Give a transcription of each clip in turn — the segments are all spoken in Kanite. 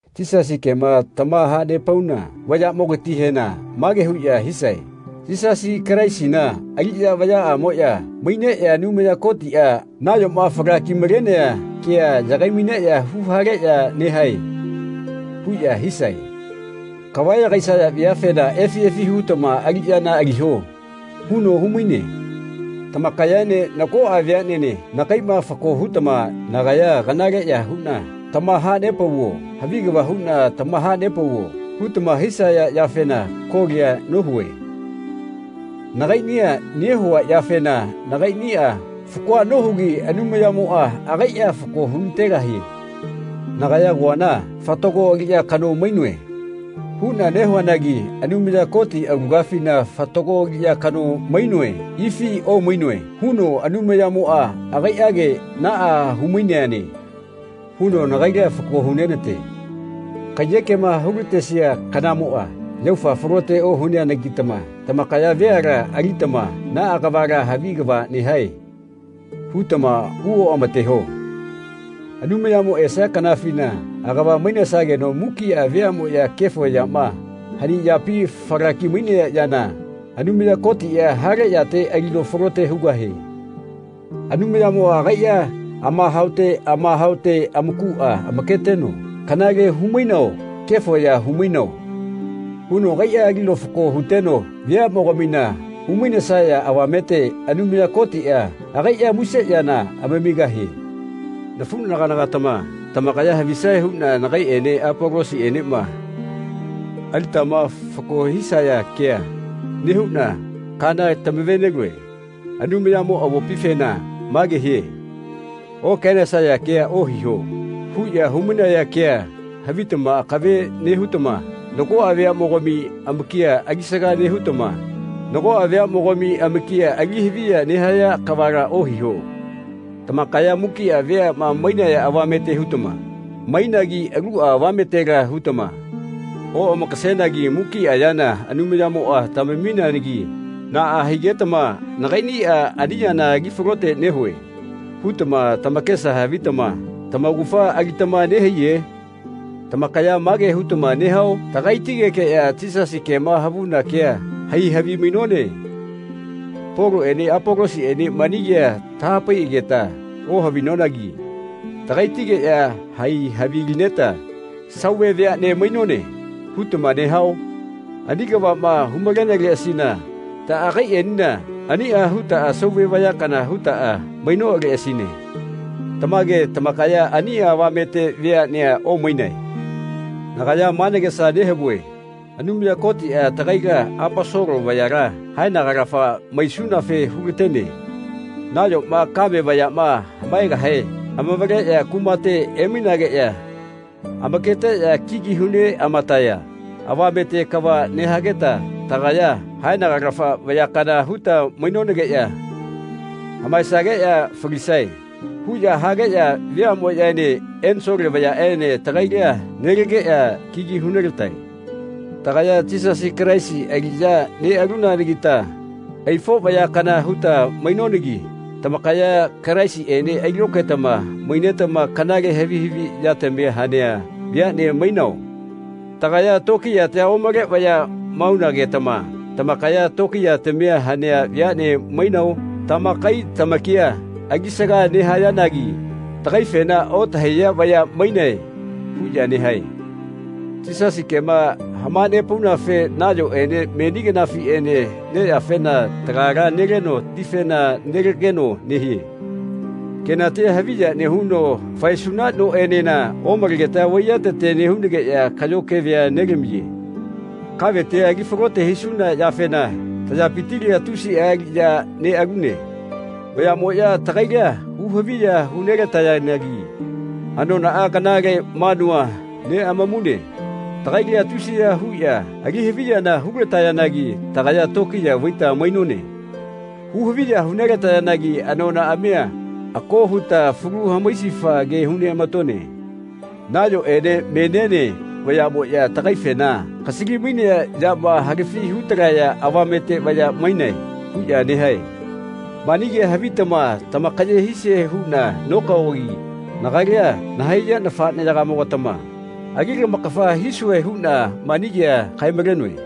Yisasi kema tamahanepauna vayaꞌmogatihena mage huꞌya hisae “Yisasi Kalaisina aliꞌya vayaꞌamoꞌya maineꞌya Anumaya Kotiꞌa nayoma falaki-malenea kea yagai-maineꞌya huhaleꞌya nehae.” huꞌya hisae. Kavayagaisaya veafena “Efi efi hutama aliꞌyana aliho.” huno humaine. Tamakayaene nagoꞌa veaꞌnene nagaiꞌma fako hutama nagaya kanaleꞌya huꞌna tamahanepauvo havi kava huꞌna tamahanepauvo hutama hisaya yafena kolia nohue. Nagaiꞌnia nehua yafena nagaiꞌniꞌa fakoa nohugi Anumayamoꞌa agaiꞌa fako hunategahie. Nagaya agoana “Fatago aliꞌya kano mainoe.” huꞌna nehuanagi Anumaya Koti aulagafina fatago aliꞌya kano maino ifi omainoe huno Anumayamoꞌa agaiꞌage “Naꞌa humainane.” huno nagaila fako hunenate. Kaiyekema hulatesia kanamoꞌa yaufa falote ohuneanagitama tamakaya veala alitama “Naꞌa kavala havi kava nehae.” hutama hu oꞌamateho. Anumayamo esia kanafina agava mainesageno mukiꞌa veaꞌmoꞌya kefo yama, hani yapi falaki-mainea yana, Anumaya Kotiꞌa hale yate alino falote hugahie. Anumayamoꞌa agaiꞌa amahaote amahaote amakuꞌa amaketeno “Kanale humainao kefo ya humainao.” huno agaiꞌa alino fako huteno veaꞌmogamina humainesaya avamete Anumaya Kotiꞌa agaiꞌa muse yana amamigahie. Nafuꞌnagana-gatama tamakaya havisae huꞌna nagaiꞌene Apolosiꞌenema alitama fako ohisaya kea nehuꞌna kaana tamave-nelue. Anumayamo avopifena mage hie “Okaenesaya kea ohiho.” huꞌya humainaya kea havitama akave nehutama nagoꞌa veaꞌmogami amakia alisaga nehutama nago veaꞌmogami amakia ali haviya nehaya kavala ohiho. Tamakaya mukiꞌa veaꞌma mainaya avamete hutama mainagi aluꞌa avametela hutama oꞌamakasenagi mukiꞌa yana Anumayamoꞌa tamamineanagi naꞌa higetama “Nagaiꞌniꞌa ani yana ali falote nehue.” hutama tamakesa havitama tamaugafa alitama nehaiye? Tamakaya ma ke hutama nehao? “Tagaitigekeꞌya Yisasi kema havuna kea hai havimainone. Poloꞌene Apolosiꞌene mani kea tahapaiꞌageta ohavinonagi tagaitigeꞌya hai havilineta sauve veaꞌne mainone.” hutama nehao? Ani kavaꞌma humaineleꞌasina taꞌagaiꞌenena aniꞌa hutaꞌa sauve vaya kana hutaꞌa mainoꞌaleꞌasine. Tamage tamakaya ani avamete veaꞌnea omainae. Nagaya ma nagesa nehavue Anumaya Kotiꞌa tagaila Aposolo vayala haenagalafa maisunafe hulatene. Nayoma kame vayaꞌma hamaegahe amavaleꞌya kumate emainageꞌya amaketeꞌya kigi hu neꞌamataya avamete kava nehageta tagaya haenagalafa vaya kana huta mainonageꞌya “Hamaesageꞌya falisae.” huꞌya hageꞌya veaꞌmoꞌyaene ensole vayaꞌene tagaila nelageꞌya kigi hunelatae. Tagaya Yisasi Kalaisi aliꞌya neꞌalunanagita aifo vaya kana huta mainonagi tamakaya Kalaisiꞌene ailokaetama mainetama kanale havi haviꞌyatami hanea veaꞌne mainao? Tagaya tokiyatia omale vaya maunagetama tamakaya tokiyatami hanea veaꞌne mainao? Tamakai tamakia alisaga nehayanagi tagaifena “Otahaiya vaya mainae.” huꞌya nehae. Yisasi kema hamanepaunafe nayoꞌene meni kanafiꞌene neyafena lagala neleno tifena nelageno nehie. Kenatia haviya nehuno faesuna noꞌenena omalegeta vaiyatete nehunageꞌya kaꞌyo kevea nelamiye. Kaveti ali falote hisuna yafena tayapitila tusiꞌa aliꞌya neꞌalune. Vayaꞌmoꞌya tagaila hu-haviya hu nelatayanagi anonaꞌa kanale manua neꞌamamune. Tagaila tusiya huꞌya ali haviyana hulatayanagi tagaya tokiya vaita mainone. Hu-haviya hu nelatayanagi anonaꞌamia ako huta falu hamaisifa ke huneꞌamatone. Nayoꞌene meniene vayaꞌmoꞌya tagaifena “Kasali-mainea yama halafi hutalaya avamete vaya mainae.” huꞌya nehae. Mani kea havitama tamakaye hisie huꞌna nokaogi nagaila nahaiya nafaꞌneyagamo-gatama ali lamakafa hisue huꞌna mani kea kae-malenoe.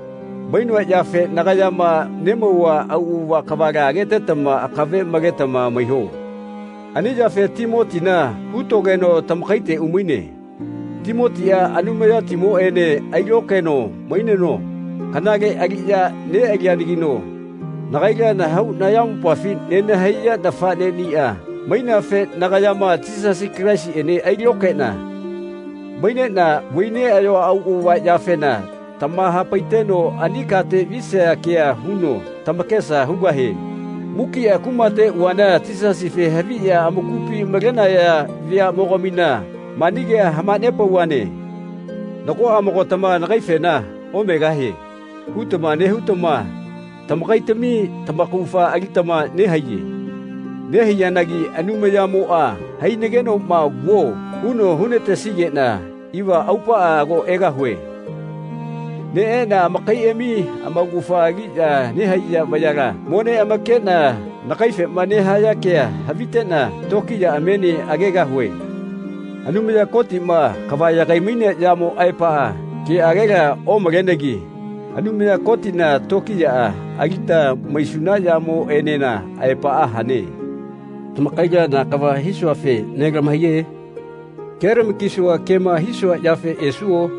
Mainoa yafe nagayama nemauva auꞌava kavala agetetama akave maletama maiho. Ani yafe Timotina hutogeno tamakaite umaine. Timotiꞌa Anumayatimoꞌene ailokaeno maineno kanale aliꞌya neꞌalianagino nagaila nahau nayamopafi nenahaiya nafaꞌneꞌniꞌa maineafe nagayama Yisasi Kalaisiꞌene ailokaeꞌna maineꞌna vai neꞌayoa auꞌava yafena tamahapaiteno ani kate visaya kea huno tamakesa hugahie. Mukiꞌa kumate uvana Yisasife haviꞌya amakupi malenaya veaꞌmogamina mani kea hamanepauvane. Nagoꞌamogatama nagaifena “Omegahie.” hutama nehutama tamakaitami tamaugafa alitama nehaiye. Nehaiyanagi Anumayamoꞌa hainegenoꞌma “Vuo.” huno hunatesigeꞌna iva aupaꞌa ago egahue. Neꞌeꞌna amakaiꞌami amaugafa aliꞌya nehaiya vayala mo neꞌamakeꞌna nagaifema nehaya kea haviteꞌna tokiyaꞌamiene agegahue. Anumaya Kotiꞌma kava yagai-mainea yamo aepaꞌa keꞌagela omalenegi Anumaya Kotina tokiyaꞌa alita maisuna yamoꞌenena aepaꞌa hane. Tamakaila na kava hisuafe nelamahaiye? Kelama-kisua kema hisua yafe esuo?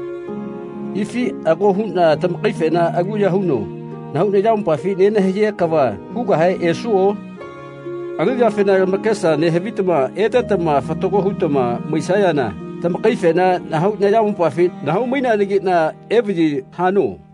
Ifi ako huꞌna tamakaifena aluya huno nahau nayamopafi nenahaiya kava hugahe esuo? Ani yafena lamakesa nehavitama etetama fatago hutama maisayana tamakaifena nahau nayamopafi nahau-mainenageꞌna evaꞌyi hano.